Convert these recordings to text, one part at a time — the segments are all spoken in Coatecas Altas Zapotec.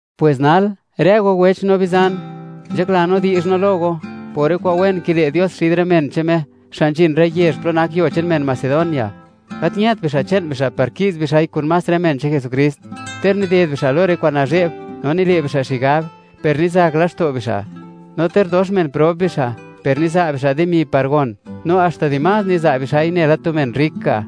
Pwes nal, rë go wech no bizan, nzhakla no di'zh no lo go, por rë kwa'n wen kile' Dios xid rë men che'n Me, xa' nzhin rë yezh plo nak yuo che'n men Macedonia, gat ñët bixa' che'n bixa' par ki'z bixa'i kun más rë men che'n Jesukrist. Ter nided bixa' lo rë kwa'n nazhe'b, no nile' bixa' xigab, per nizak laxto' bixa', no ter dox men prob bixa', per niza' bixa' dimi par gon, no haxta di más niza' bixa'i, nela tu men rrik ga'.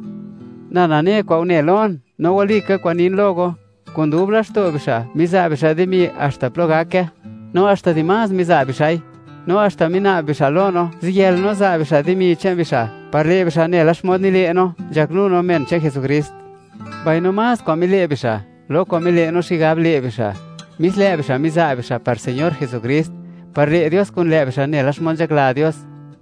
Na nane kwa'n une lon, no walika kwa'n nin lo go, kun dub laxto' bixa', miza' bixa' dimi haxta plo gake, no haxta dimás miza' bixa'i. No haxta mina'b bixa' lo no, ziyël no za' bixa' dimi che'n bixa', par le' bixa' nela xmod nile' no, nzhaknu no men che'n Jesukrist. Mbaino más kwa'n mile' bixa', lo kwa'n mile' no xigab le' bixa'. Mis lë' bixa' miza' bixa' par Señor Jesukrist, par le' Dios kun lë' bixa' nela xmod nzhakla Dios.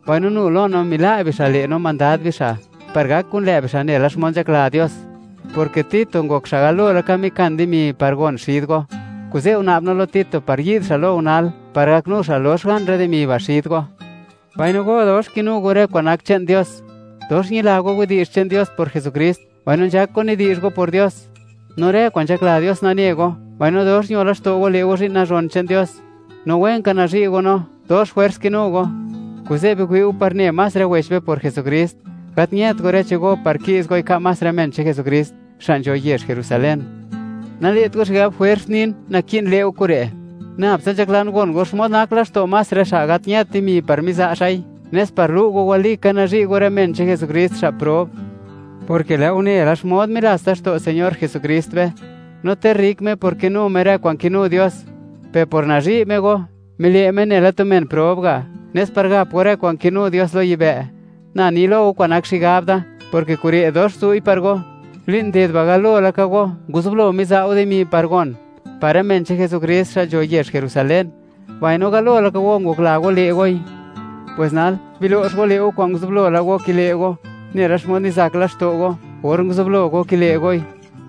Mbaino nu lo no mila' bixa' le' no mandad bixa', par gak kun lë' bixa' nela xmod nzhakla Dios. Porke Tito ngok xa' galo laka mikan dimi par gon xid go, kuze' una'b no lo Tito par yi'd xa' lo go nal, par gaknu xa' lox gan rë dimi ba' xid go. Mbaino go, dox kinu go rë kwa'n nak che'n Dios: Dox ñila go widi'zh che'n Dios por Jesukrist, mbaino nzhak go nidi'zh go por Dios, no rë kwa'n nzhakla Dios nane go, mbaino dox ño laxto' go le' go zhi'n nazhon che'n Dios, no wen ka nazhi' go no. Dox jwers kinu go. Kuze', biwi'u par ne más rë wech be por Jesukrist, gat ñët go rë che'n go par ki'z goi ka' más rë men che'n Jesukrist, xa' nzho yezh Jerusalén. Nale't go xigab jwers nin, naki'n le' go kure'; nab tsa nzhaklan gon go xmod nak laxto' más rë xa' gat ñët dimi par miza' xa'i, nes par lu' go, walika nazhi' go rë men che'n Jesukrist, xa' prob, porke lë' go une la xmod milats laxto' Señor Jesukrist be; no ter rrik Me por kinu Me rë kwa'n kinu Dios, per por nazhi' Me go, mile' Me nela tu men prob ga', nes par gap go rë kwa'n kinu Dios lo yibë'. Na ni lo go, kwa'n nak xigab da, porke kure' dox zu'i par go. Li'n nded ba', galo laka go, nguzublo miza' go dimi par gon, par rë men che'n Jesukrist xa' nzho yezh Jerusalén, mbaino galo laka go ngokla go le' goi. Pwes nal, bilo'x go le' go kwa'n nguzublo la go kile' go, nela xmod nizak laxto' go, or nguzublo go kile' goi.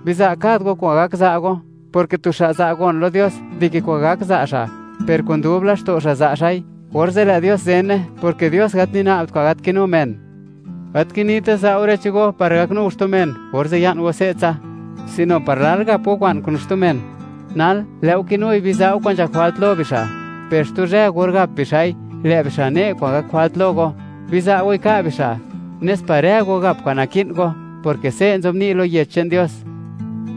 Biza' kad go kwa'n gak za' go, porke tu xa' za' gon lo Dios, dike kwa'n gak za' xa', per kun dub laxto' xa' za' xa'i, orze' lë' Dios zene, porke Dios gat nina'bt kwa'n gat kinu men. Gat kinita, za' go rë che'n go, par gaknu go xtu men, orze' ya'n go se'tsa; sino par lal gap go kwa'n kun xtu men. Nal, lë' go kinui, biza' go kwa'n nzhak jwalt lo bixa', per xtu zhë, gor gap bixa'i, lë' bixa' ne' kwa'n gak jwalt lo go. Biza' goi ka' bixa', nes par rë go gap kwa'n naki'n go, porke se' nzobni' lo Yech che'n Dios: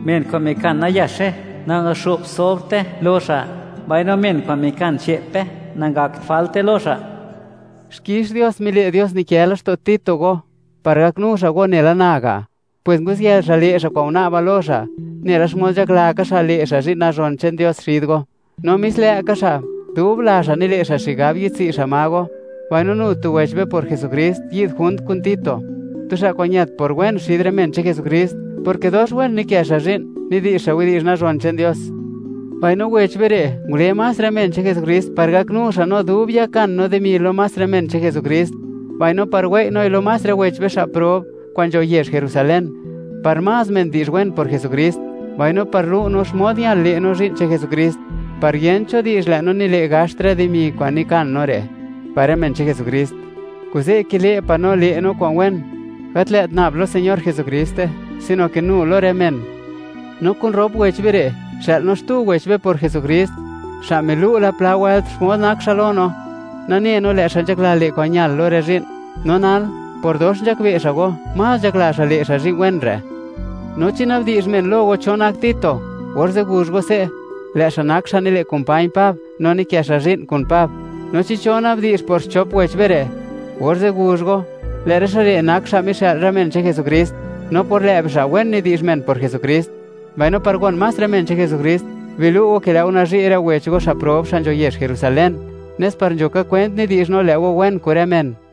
“Men kwa'n mikan nayaxe, nangaxo'bt sobrte lo xa'; mbaino men kwa'n mikan che'pe, nangakt jwalte lo xa'.” Xkix Dios mile' Dios nikë laxto' Tito go, par gaknu xa' go, nela na ga'. Pwes nguziyël xa' le' xa' kwa'n una'ba lo xa', nela xmod nzhakla ka xa' le' xa' zhi'n nazhon che'n Dios xid go. No mis lë' ka xa', dub la xa' nile' xa' xigab yi'dtswi' xa' ma go. Mbaino nu tu wech be por Jesukrist, yi'd junt kun Tito; tu xa' kwa'n ñët por wen xid rë men che'n Jesukrist, porke dox wen nikë xa' zhi'n nidi'zh xa' widi'zh nazhon che'n Dios. Mbaino, wech be re', ngule más rë men che'n Jesukrist, par gaknu xa' no dub yakan no dimi lo más rë men che'n Jesukrist, mbaino par wei' noi lo más rë wech be xa' prob kwa'n nzho yezh Jerusalen, par más men di'zh wen por Jesukrist, mbaino par lu' no, xmod ñal le' no zhi'n che'n Jesukrist, par yent cho di'zh, lë' no nile' gaxt rë dimi kwa'n nikan no re', par rë men che'n Jesukrist. Kuze' kile' pa' no, le' no kwa'n wen, gat lë't nab lo Señor Jesukriste, sino ke nu lo rë men. No kun rop wech be re', xë'l no xtu wech be por Jesukrist, xa' milu' la pla wëlt, xmod nak xa' lo no, nane no, lë' xa' nzhakla le' kwa'n ñal lo rë zhi'n, no nal, por dox nzhakbe' xa' go, más nzhakla xa', le' xa' zhi'n wen re'. No chi na'bdi'zh men lo go cho nak Tito, orze' guzh go se': “Lë' xa' nak xa' nile' kumpañ Pab, no nikë xa' zhi'n kun Pab.” No chi cho na'bdi'zh por xchop wech be re', orze' guzh go, lë' rë xa' re' nak xa' mixë'l más rë men che'n Jesukrist, no por lë' bixa', wen nidi'zh men por Jesukrist. Mbaino par gon más rë men che'n Jesukrist, bilu' go ke lë' go nazhi' rë wech go xa' prob, xa' nzho yezh Jerusalen, nes par nzho ka kwent nidi'zh no, lë' go wen kun rë men.